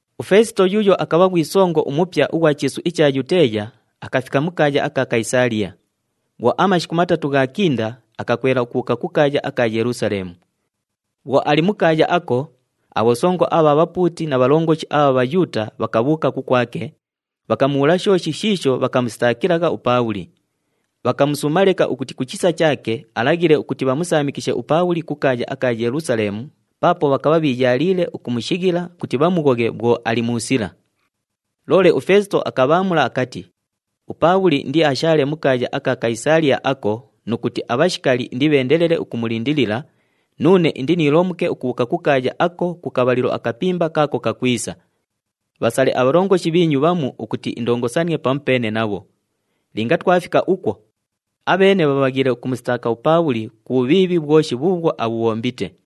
UFeesito yuuyo akabha ghwi songo umupya ughwa chiisu icha Yuteeya, akafika mu kaaya aka Kayisaaliya. Bhwo amashiku matatu ghaakinda, akakwela ukubhuuka ku kaaya aka Yelusaleemu. Bhwo ali mu kaaya ako, abhosongo abha bhapuuti na bhalongoshi abha Bhayuuta bhakabhuuka kukwake, bhakamubhuula shooshi shiisho bhakamusitaakilagha uPaabhuli. Bhakamusuuma leka ukuti ku chisa chaake alaghile ukuti bhamusaamikishe uPaabhuli ku kaaya aka Yelusaleemu, paapo bhakabha bhiiyaaliile ukumushighila ukuti bhamughoghe bhwo ali mu sila. Loole uFeesito akabhaamula akati, “UPaabhuli indiashaale mu kaaya aka Kayisaaliya ako nu kuti abhashikali indibheendelele ukumulindilila, nuune indiniilomuke ukubhuuka ku kaaya ako ku kabhalilo akapimba kaako kakwisa. Bhasale abhalongoshi bhiinyu bhamu ukuti indongosanie pamupeene nabho. Linga twafika ukwo, abheene bhabhaghiile ukumusitaaka uPaabhuli ku bhubhiibhi bhwoshi bhuubhwo abhubhombite.”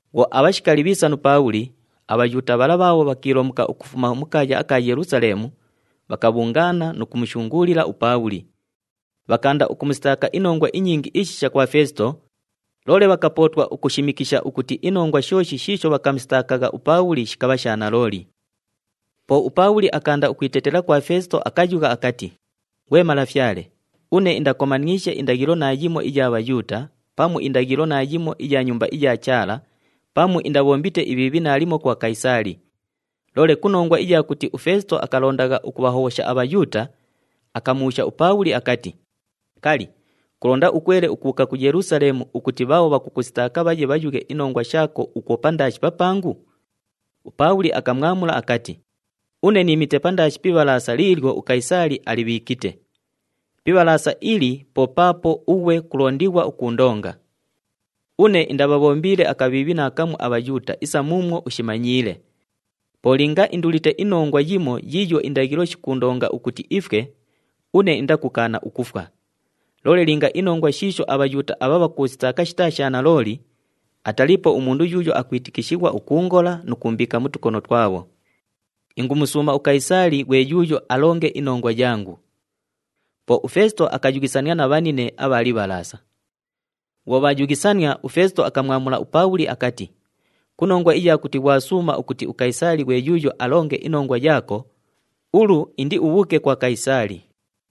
Bhwo abhashikali bhiisa nu Paabhuli, aBhayuuta bhala bhaabho bhakiilomuka ukufuma mu kaaya aka Yelusaleemu, bhakabhungaana nu kumushunguulila uPaabhuli. Bhakaanda ukumusitaaka inongwa inyingi ishisha kwa Feesito, loole bhakapootwa ukushimikisha ukuti inongwa shooshi shiisho bhakamusitaakagha uPaabhuli shikabha sha nalooli. Po uPaabhuli akaanda ukwitetela kwa Feesito, akayugha akati, “Ghwe malafyale, une indakomaniishe indaghilo naayimo iya Bhayuuta pamu indaghilo naayimo iya Nyumba iya Chaala pamu indabhombite ibhiibhi naalimo kwa Kayisaali.” Loole ku nongwa iya kuti uFeesito akalondagha ukubhahobhosha aBhayuuta, akamubhuusha uPaabhuli akati, “Kali, kulonda ukwele ukubhuuka ku Yelusaleemu ukuti bhaabho bhakukusitaaka bhaye bhayughe inongwa shaako ukwo pandaashi papangu?” UPaabhuli akamwamula akati, “Une niimite pandaashi pi ibhalaasa liilyo uKayisaali alibhiikite. Pi ibhalaasa ili po paapo ughwe kulondighwa ukuundonga. Une indabhabhombiile akabhiibhi naakamu aBhayuuta isa muumwo ushimanyiile. Po linga indulite inongwa yimo yiiyo indaghilo shikuundonga ukuti ifwe, une indakukaana ukufwa. Loole linga inongwa shiisho aBhayuuta abha bhakuusitaaka shitaa sha nalooli, ataliipo umundu yuuyo akwitikishighwa ukuungola nu kuumbiika mu tukono twabho. Ingumusuuma uKayisaali ghwe yuuyo alonge inongwa yangu!” Po uFeesito akayughisania na bhanine abha libhalaasa. Bhwo bhaayughisania, uFeesito akamwamula uPaabhuli akati, “Ku nongwa iya kuti ghwasuuma ukuti uKayisaali ghwe yuuyo alonge inongwa yaako, ulu indiubhuuke kwa Kayisaali!”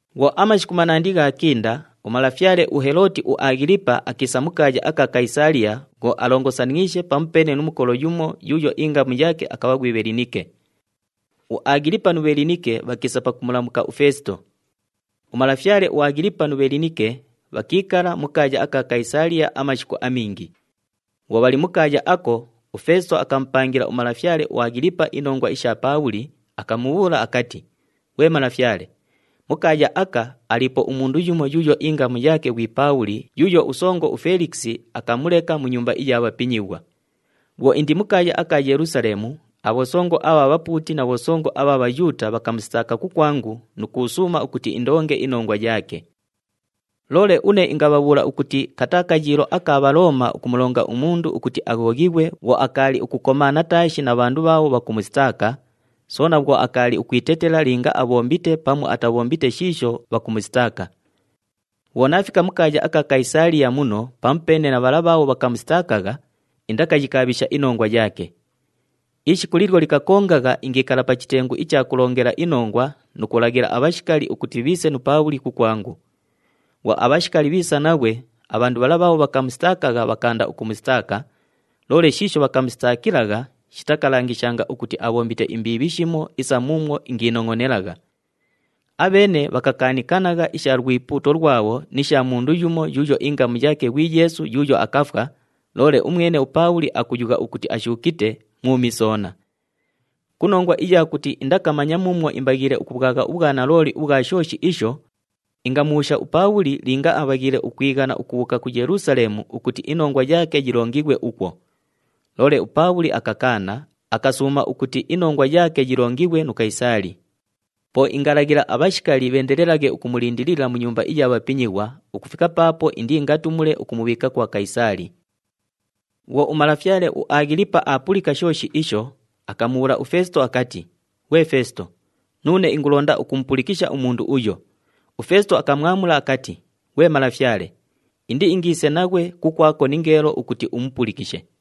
Bhwo amashiku manandi ghaakinda, umalafyale uHelooti uAghilipa akiisa mu kaaya aka Kayisaaliya bhwo alongosaniishe pamupeene nu mukolo yumo yuuyo ingamu yaake akabha ghwi Bhelinike. UAghilipa nu Bhelinike bhakiisa pakumulamuka uFeesito. Umalafyale uAghilipa nu Bhelinike bhakiikala mu kaaya aka Kayisaaliya amashiku amingi. Bhwo bhali mu kaaya ako, uFeesito akamupangila umalafyale uAghilipa inongwa isha Paabhuli, akamubhuula akati, “Ghwe malafyale, mu kaaya aka, aliipo umundu yumo yuuyo ingamu yaake ghwi Paabhuli yuuyo usongo uFelikisi akamuleka mu nyumba iya bhapinyighwa. Bhwo indi mu kaaya aka Yelusaleemu, abhosongo abha bhapuuti na bhosongo abha Bhayuuta bhakamusitaaka kukwangu nu kuusuuma ukuti indonge inongwa yaake. “Loole une ingabhabhuula ukuti kataa kayiilo aka Bhalooma ukumulonga umundu ukuti aghoghighwe bhwo akaali ukukomaana taashi na bhandu bhaabho bhakumusitaaka, soona bhwo akaali ukwitetela linga abhombite pamu atabhombite shiisho bhakumusitaaka. Bhwo naafika mu kaaya aka Kayisaaliya muno pamupeene na bhala bhaabho bhakamusitaakagha, indakayikaabhisha inongwa yaake. Ishiku liilyo likakongagha ingiikala pa chitengu icha kulongela inongwa nu kulaghila abhashikali ukuti bhiise nu Paabhuli kukwangu. Bhwo abhashikali bhiisa naghwe, abhandu bhala bhaabho bhakamusitaakagha bhakaanda ukumusitaaka, loole shiisho bhakamusitaakilagha shitakalangishanga ukuti abhombite imbiibhi shimo isa muumwo ingiinongʼonelagha. Abheene bhakakaanikanagha isha lwipuuto lwabho ni sha mundu yumo yuuyo ingamu yaake ghwi Yeesu yuuyo akafwa, loole umwene uPaabhuli akuyugha akuti ashuukite, mwumi soona. Ku nongwa iya kuti indakamanya muumwo imbaghiile ukubhwagha ubhwanalooli ubhwa shooshi isho, ingamubhuusha uPaabhuli linga abhaghiile ukwighana ukubhuuka ku Yelusaleemu ukuti inongwa yaake yilongighwe ukwo. Loole uPaabhuli akakaana, akasuuma ukuti inongwa yaake yilongighwe nu Kayisaali. Po ingalaghila abhashikali bheendelelaghe ukumulindilila mu nyumba iya bhapinyighwa, ukufika paapo indiingatumule ukumubhiika kwa Kayisaali.” Bhwo umalafyale uAghilipa aapulika shooshi isho, akamubhuula uFeesito akati, “Ghwe Feesito, nuune ingulonda ukumupulikisha umundu uyo.” UFeesito akamwamula akati, “Ghwe malafyale, indiingiise naghwe kukwako ningeelo ukuti umupulikishe.”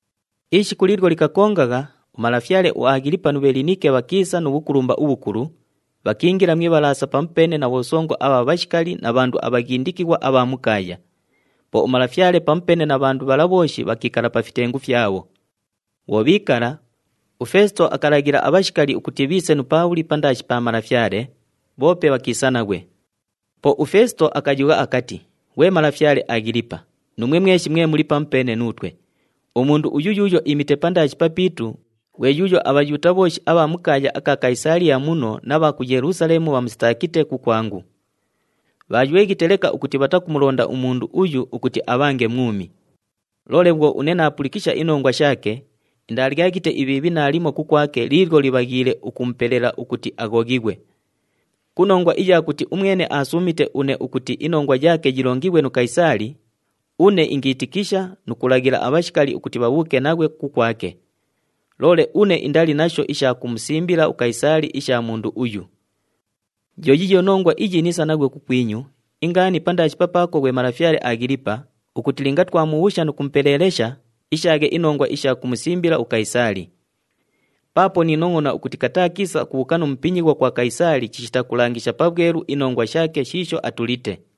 Ishiku liilyo likakongagha, umalafyale uAghilipa nu Bhelinike bhakiisa nu bhukulumba ubhukulu, bhakiingila mu ibhalaasa pamupeene na bhosongo abha bhashikali na bhandu abhaghindikighwa abha mu kaaya. Po umalafyale pamupeene na bhandu bhala bhooshi bhakiikala pa fitengu fyabho. Bhwo bhiikala, uFeesito akalaghila abhashikali ukuti bhiise nu Paabhuli pandaashi pa malafyale, bhoope bhakiisa naghwe. Po uFeesito akayugha akati, “Ghwe malafyale Aghilipa, nuumwe mweshi mwe muli pamupeene nuutwe, umundu uyu yuuyo iimite pandaashi papiitu, ghwe yuuyo aBhayuuta bhooshi abha mu kaaya aka Kayisaaliya muno na bha ku Yelusaleemu bhaamusitaakite kukwangu. Bhaayweghite leka ukuti bhatakumulonda umundu uyu ukuti abhange mwumi. Loole bhwo une naapulikisha inongwa shaake, indaalyaghite ibhiibhi naalimo kukwake liilyo libhaghiile ukumupelela ukuti aghoghighwe. Ku nongwa iya kuti umwene aasuumite une ukuti inongwa yaake yilongighwe nu Kayisaali, une ingiitikisha nu kulaghila abhashikali ukuti bhabhuuke naghwe kukwake. Loole une indali nasho isha kumusimbila uKayisaali isha mundu uyu. Yo yiiyo nongwa iyi niisa naghwe kukwinyu, ingaani pandaashi papaako, ghwe malafyale Aghilipa, ukuti linga twamubhuusha nu kumupeleelesha, ishaaghe inongwa isha kumusimbila uKayisaali. Paapo niinongʼona ukuti kataa kiisa ukubhuuka nu mupinyighwa kwa Kayisaali chishita kulangisha pabhwelu inongwa shaake shiisho atulite.”